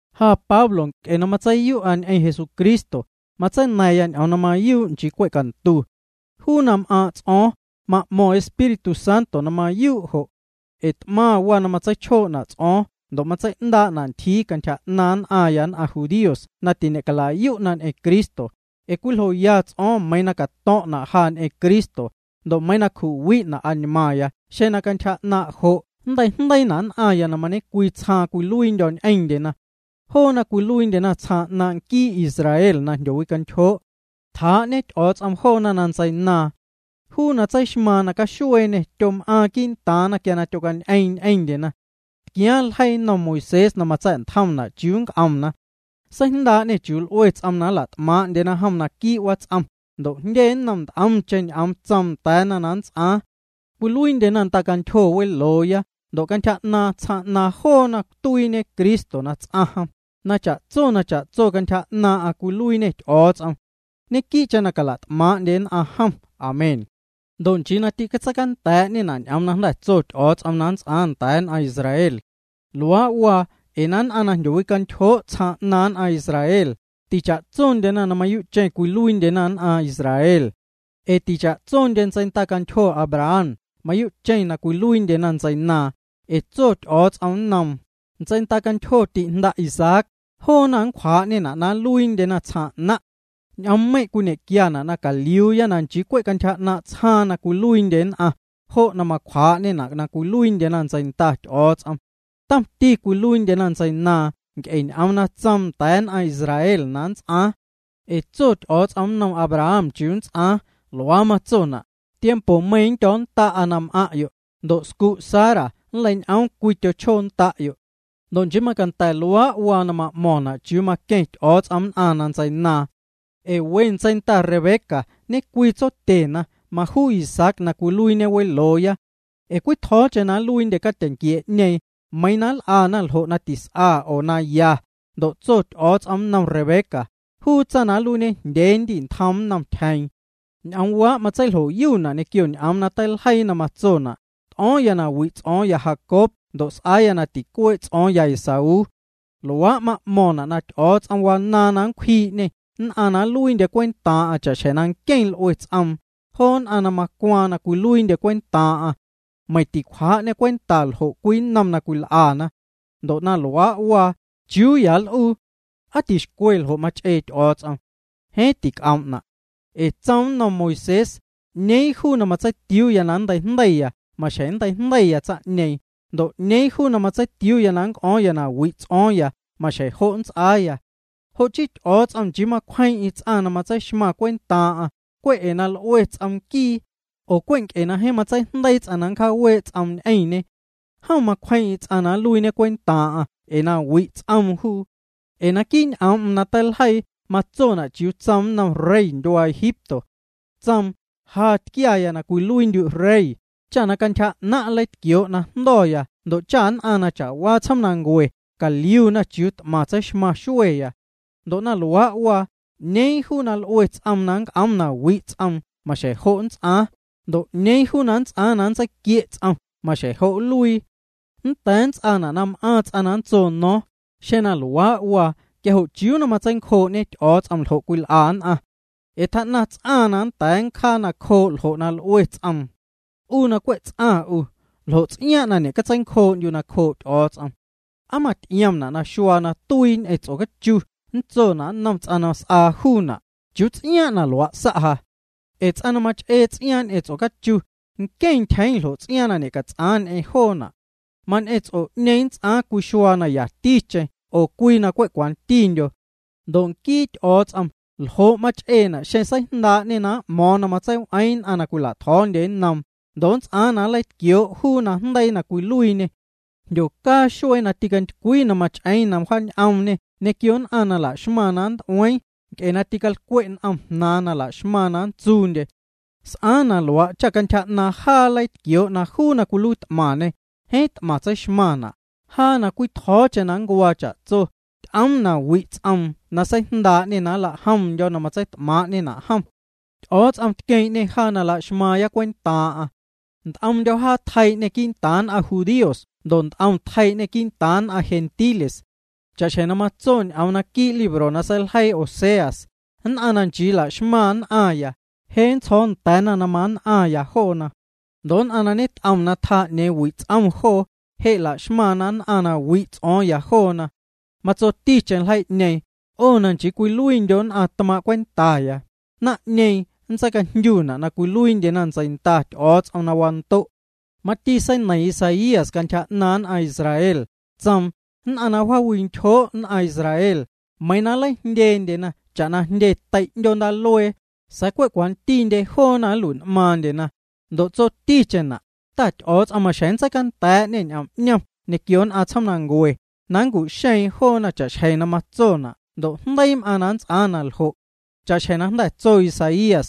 Ja Pablo, nc'e na matseiyu'a ñ'eⁿ Jesucristo, matseina̱ⁿya ñ'oom na mayuu', nchii cwe' cantu. Juu na m'aaⁿ' ts'o̱o̱ⁿ, ma'mo̱ⁿ Espíritu Santo na mayuu' jo'. Ee t'maⁿ waa na matseichjoo'na' ts'o̱o̱ⁿ ndo' matsei'ndaa'na ntyjiiya cantyja 'naaⁿ nn'aⁿya nn'aⁿ judíos na ti'ñe'calayu' ñ'eⁿ Cristo, ee cwiljoya ts'o̱o̱ⁿ meiiⁿ na cato̱ⁿ'na' ja ñ'eⁿ Cristo, ndo' meiiⁿ nncju'wi'na' añmaaⁿya xeⁿ na cantyja 'naaⁿ' jo' nnteijndeiina' nn'aⁿya na mañe'cwii tsjaaⁿ cwiluiindyo̱ ñ'eⁿndyena. Joona cwiluiindyena tsjaaⁿ 'naaⁿ' nquii Israel na jndyowicantyjoo'. Tjaa'ñe Ty'o̱o̱ts'om joona na ntseinaaⁿ. Juu na tseixmaaⁿ na caxueeñê tyom'aaⁿ quii'ntaaⁿna quia na tyocañ'eeⁿ ñ'eⁿndyena. Tquiaaⁿ ljeii nnom Moisés na matsa̱'ntjomna' chiuu nnc'omna. Seijndaa'ñê chiuu l'ue ts'oom na nla't'maaⁿ'ndyena jom naquii' wats'om, ndo' jndye nnom nt'omcheⁿ ñ'oom tsoom nda̱a̱na na nnts'aaⁿ. Cwiluiindyena ndacantyjo welooya ndo' cantyja 'naaⁿ' tsjaaⁿ 'naaⁿ joona tuiiñe Cristo na ts'aⁿ jom, na cha'tso na cha'tso cantyja 'naaⁿ'aⁿ cwiluiiñê Ty'o̱o̱ts'om. Ñequii'cheⁿ na cala't'maaⁿ'ndye nn'aⁿ jom. Amén. Ndo' meiⁿ nchii ñ'oom na tso Ty'o̱o̱ts'om nda̱a̱ nn'aⁿ Israel na nnts'aaⁿ, tîcatseicanda̱a̱'ñena'. Luaa' waa ee nn'aⁿ na jndyowicantyjoo' tsjaaⁿ 'naaⁿ nn'aⁿ Israel, ticha'tsondyena na mayuu'cheⁿ cwiluiindyena nn'aⁿ Israel. Ee ticha'tsondye ntseindacantyjo Abraham mayuu'cheⁿ na cwiluiindyena ntseinaaⁿ, ee tso Ty'o̱o̱ts'om nnoom: “Ntseindacantyjo ti'jnda' Isaac, joona nncwjaa'ñena' na nluiindyena tsjaaⁿ 'naⁿ'.” Ñ'oommeiⁿ' cwiñe'quiana' na caliuuya na nchii cwe' cantyja 'naaⁿ' tsjaaⁿ na cwiluiindye nn'aⁿ, jo' na macwjaa'ñena' na cwiluiindyena ntseinda Ty'o̱o̱ts'om. Tomti cwiluiindyena ntseinaaⁿ nc'e ñ'oom na tsoom nda̱a̱ nn'aⁿ Israel na nnts'aaⁿ. Ee tso Ty'o̱o̱ts'om nnom Abraham chiuu na nnts'aaⁿ, luaa matsona': “Tiempomeiiⁿ nndyo̱o̱nnda'a na m'aⁿ'yo', ndo' nquii scu' Sara nnleiñ'oom cwii tyochjoo nda'yo'.” Ndo' nchii macanda̱ luaa' waa na ma'mo̱ⁿna' chiuu na maqueⁿ Ty'o̱o̱ts'om nn'aⁿ na ntseinaaⁿ. Ee we ntseinda Rebeca ñecwii tsotyena majuu Isaac na cwiluiiñe welooya. Ee cwitjo̱o̱cheⁿ na nluiindye catyeⁿnquiee'ñeeⁿ, meiⁿ na l'ana na tis'a oo ljo' na ya, ndo' tso Ty'o̱o̱ts'om nnom Rebeca: “Juu tsaⁿ na nluiiñejndyee nndi'ntjoom nnom tyjeeⁿ.” Ñ'oomwaa' matseiljoyuna' ñequio ñ'oom'm na teiljeii na matsona': “T'o̱o̱ⁿya na wi' ts'o̱o̱ⁿya Jacob ndo' s'aaya na ticuee' ts'o̱o̱ⁿya Esaú.” Luaa' ma'mo̱ⁿna' na Ty'o̱o̱ts'om wanaaⁿ na nncwjii'ñê nn'aⁿ na nluiindye cwentaaⁿ'aⁿ cha'xjeⁿ nqueⁿ na l'ue ts'oom, joo nn'aⁿ na macwaaⁿ na nluiindyena cwentaaⁿ'aⁿ. Meiⁿ ticwjaa'ñê cwenta ljo' cwii nnom na cwil'ana. Ndo' na luaa' waa, ¿chiuu ya nl'uu? ¿Aa ticwixcwe ljo' mach'ee Ty'o̱o̱ts'om? Jeeⁿ tic'oom'na'. Ee tsoom nnom Moisés: “'Ñeeⁿ juu na matseitiuuya na nnteijndeiya maxjeⁿ nnteijndeiya tsaⁿ'ñeeⁿ, ndo' 'ñeeⁿ juu na matseitiuuya na nnc'o̱o̱ⁿya na wi' ts'o̱o̱ⁿya maxjeⁿ jo' nnts'aaya.” Jo' chii Ty'o̱o̱ts'om nchii macwjeeⁿ'eⁿ ts'aⁿ na nntseixmaⁿ cwentaaⁿ'aⁿ cwe' ee na l'ue ts'om nquii, oo cwe' nc'e na jeeⁿ matseijndeii ts'aⁿ na nncjaawee' ts'oom ñ'eⁿñe. Jom macwjeeⁿ'eⁿ ts'aⁿ na nluiiñe cwentaaⁿ'aⁿ ee na wi' ts'oom juu. Ee naquii' ñ'oom'm na teiljeii matsona' chiuu tsoom nnom rey ndyuaa Egipto. Tsoom: “Ja tquiaya na cwiluiindyu' rey, cha cantyja 'naⁿ' nleitquioo' na jndo̱ya ndo' cha nn'aⁿ na cha'waa tsjoomnancue caliuna chiuu t'maⁿ tseixmaⁿ xueya.” Ndo' na luaa' waa, 'ñeeⁿ juu na l'ue ts'oom na nnc'oom na wi' ts'oom maxjeⁿ jo' nnts'aaⁿ, ndo' 'ñeeⁿ juu na nnts'aaⁿ na nntseiquie' ts'om, maxjeⁿ jo' nluii. Nnda̱a̱ nnts'aana' na m'aaⁿ ts'aⁿ na nntso no̱o̱ⁿ: “Xeⁿ na luaa' waa quia jo' ¿chiuu na matseincjoo'ñe Ty'o̱o̱ts'om ljo' cwil'a nn'aⁿ? Ee tjaa'naⁿ ts'aⁿ nnda̱a̱ nncjaa nacjoo' ljo' na l'ue ts'oom.” 'U na cwe' ts'aⁿ 'u, ¿ljo' ts'iaaⁿ' na ñe'catseincjoo'ndyu' nacjoo' Ty'o̱o̱ts'om? ¿Aa maty'iomna' na xuaa na tuii ñ'eⁿ ts'ocachu nntsona' nnom ts'aⁿ na s'aa juuna': “¿Chiuu ts'iaaⁿ' na luaa' sa' ja?” Ee ts'aⁿ na mach'ee ts'iaaⁿ ñ'eⁿ ts'ocachu, nqueⁿ ntyjeeⁿ ljo' ts'iaaⁿ na ñe'cats'aaⁿ ñ'eⁿ joona'. Mañ'eⁿ ts'o'ñeeⁿ nnts'aaⁿ cwii xuaa na yaticheⁿ oo cwii na cwe' cwantindyo. Ndo' nquii Ty'o̱o̱ts'om ¿ljo' mach'eena' xeⁿ seijndaa'ñê na m'mo̱o̱ⁿ na matseiw'eeⁿ nn'aⁿ na cwila'tjo̱o̱ndyena nnoom, ndo' nnts'aaⁿ na nleitquioo' juu najndeii na cwiluiiñê? Jndyocaa xuee na tintycwii na mach'eeⁿ na wjaanioomñe ñequio nn'aⁿ na la'xmaⁿ na nnt'ueeⁿ joona nc'e na ticalcwe' n'omna jnaaⁿna, na la'xmaⁿna na nntsuundyena. S'aaⁿ na luaa' cha cantyja 'naaⁿ jaa nleitquioo' na juu na cwiluiit'maⁿñê, jeeⁿ t'maⁿ tseixmaⁿna', jaa na cwitjo̱o̱cheⁿ na ncuaa cha'tso, ty'oom na wi' ts'oom na seijndaa'ñê na nla'jomndyo̱ na matseit'maaⁿ'ñena' jom. Ty'o̱o̱ts'om tqueeⁿ'ñê jaa na la'xmaaⁿ cwentaaⁿ'aⁿ. Nt'omndyo̱ jaa tjeii'ñê quii'ntaaⁿ nn'aⁿ judíos ndo' nt'om tjeii'ñê quii'ntaaⁿ nn'aⁿ gentiles. Cha'xjeⁿ na matso ñ'oom naquii' libro na seiljeii Oseas: Nn'aⁿ na nchii laxmaⁿ nn'aⁿya, je' nntsjo̱o̱ nda̱a̱na na mann'aⁿya joona. Ndo' nn'aⁿ na ñet'om na tjaa 'ñeeⁿ wi' ts'om joo, je' la'xmaⁿna nn'aⁿ na wi' ts'o̱o̱ⁿya joona. Matsoticheⁿ ljeii'ñeeⁿ: “'O na nchii cwiluiindyo' nn'aⁿ tmaaⁿ' cwentaya”, naⁿ'ñeeⁿ nntseicajndyu'na' na cwiluiindyena ntseinda Ty'o̱o̱ts'om na wando'. Mati seineiⁿ Isaías cantyja 'naaⁿ nn'aⁿ Israel, tsoom: “Nn'aⁿ na wjaawicantyjoo' nn'aⁿ Israel, meiiⁿ na nleijndyendyena cha'na jndye tei' 'ndyoo ndaaluee, sa̱a̱ cwe' cwantindye joona nlui'n'maaⁿndyena.” Ndo' tjatsoticheⁿna': “Ta Ty'o̱o̱ts'om maxjeⁿ nntseicanda̱a̱'ñê ñ'om 'ñom ñequio nn'aⁿ tsjoomnancue, na nncu'xeeⁿ joona cha'xjeⁿ na matsona' ndo' jndeii m'aaⁿ na nnts'aaⁿ na ljo'.” Cha'xjeⁿ na jnda̱ tso Isaías: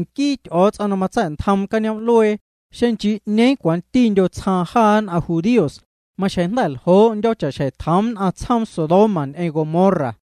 Nquii Ty'o̱o̱ts'om na matsa̱'ntjoom cañoom'luee, xeⁿ nchii 'ñeeⁿ cwantindyo tsjaaⁿ jaa nn'aⁿ judíos, maxjeⁿ jnda̱ ljoo'ndyo̱ cha'xjeⁿ tjoom nn'aⁿ tsjoom Sodoma ñ'eⁿ Gomorra.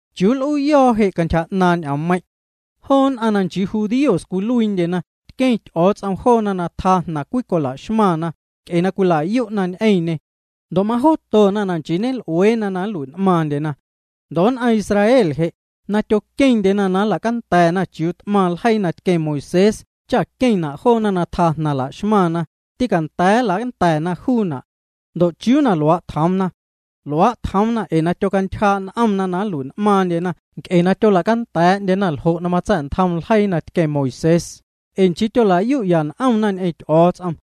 ¿Chiuu nl'uuyo̱o̱ je' cantyja 'naaⁿ' ñ'oommeiⁿ'? Joo nn'aⁿ na nchii judíos cwiluiindyena tqueⁿ Ty'o̱o̱ts'om joona na tjaa jnaⁿ cwicola'xmaⁿna, nc'e na cwila'yu'ya n'omna ñ'eⁿñê. Ndo' majootona na nchii ñel'ueena na nlui'n'maaⁿndyena. Ndo' nn'aⁿ Israel je', na tyoqueⁿndyena na nla'canda̱a̱'ndyena chiuu t'maⁿ ljeii na tqueⁿ Moisés cha queⁿna' joona na tjaa jnaⁿ la'xmaⁿna, tîcanda̱a̱ nla'canda̱na juuna'. ¿Ndo' chiuu na luaa' tjoomna? Luaa' tjoomna ee tyocantyjaa'ya n'omna na nlui'n'maaⁿndyena nc'e na tyola'canda̱a̱'ndyena ljo' na matsa̱'ntjom ljeii na tqueⁿ Moisés, ee nchii tyola'yu'ya n'omna ñ'eⁿ Ty'o̱o̱ts'om.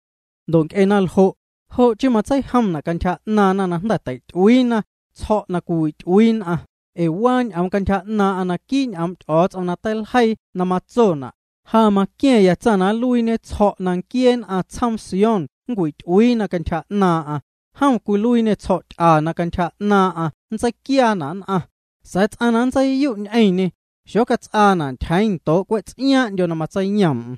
Ndo' nc'e naljo', jo' chii matseijoom'na' cantyja 'naaⁿna na jnda̱ tei'ty'uiina “Tsjo̱' na cwiwi'ty'uii nn'aⁿ” ee waa ñ'oom cantyja 'naaⁿ'aⁿ naquii' ñ'oom' Ty'o̱o̱ts'om na teiljeii na matsona': Ja maquia̱ⁿya tsaⁿ na nluiiñe tsjo̱' na nquiee nn'aⁿ tsjoom Sión nncwity'uiina cantyja 'naaⁿ'aⁿ, jom nluiiñê tsjo̱'ty'a na cantyja 'naaⁿ'aⁿ nntseiquiaana' nn'aⁿ, sa̱a̱ ts'aⁿ na nntseiyu' ñ'eⁿñê, xocats'aana' ntyjeeⁿ ndoo' cwe' ts'iaaⁿ'ndyo na matseiyoom'm.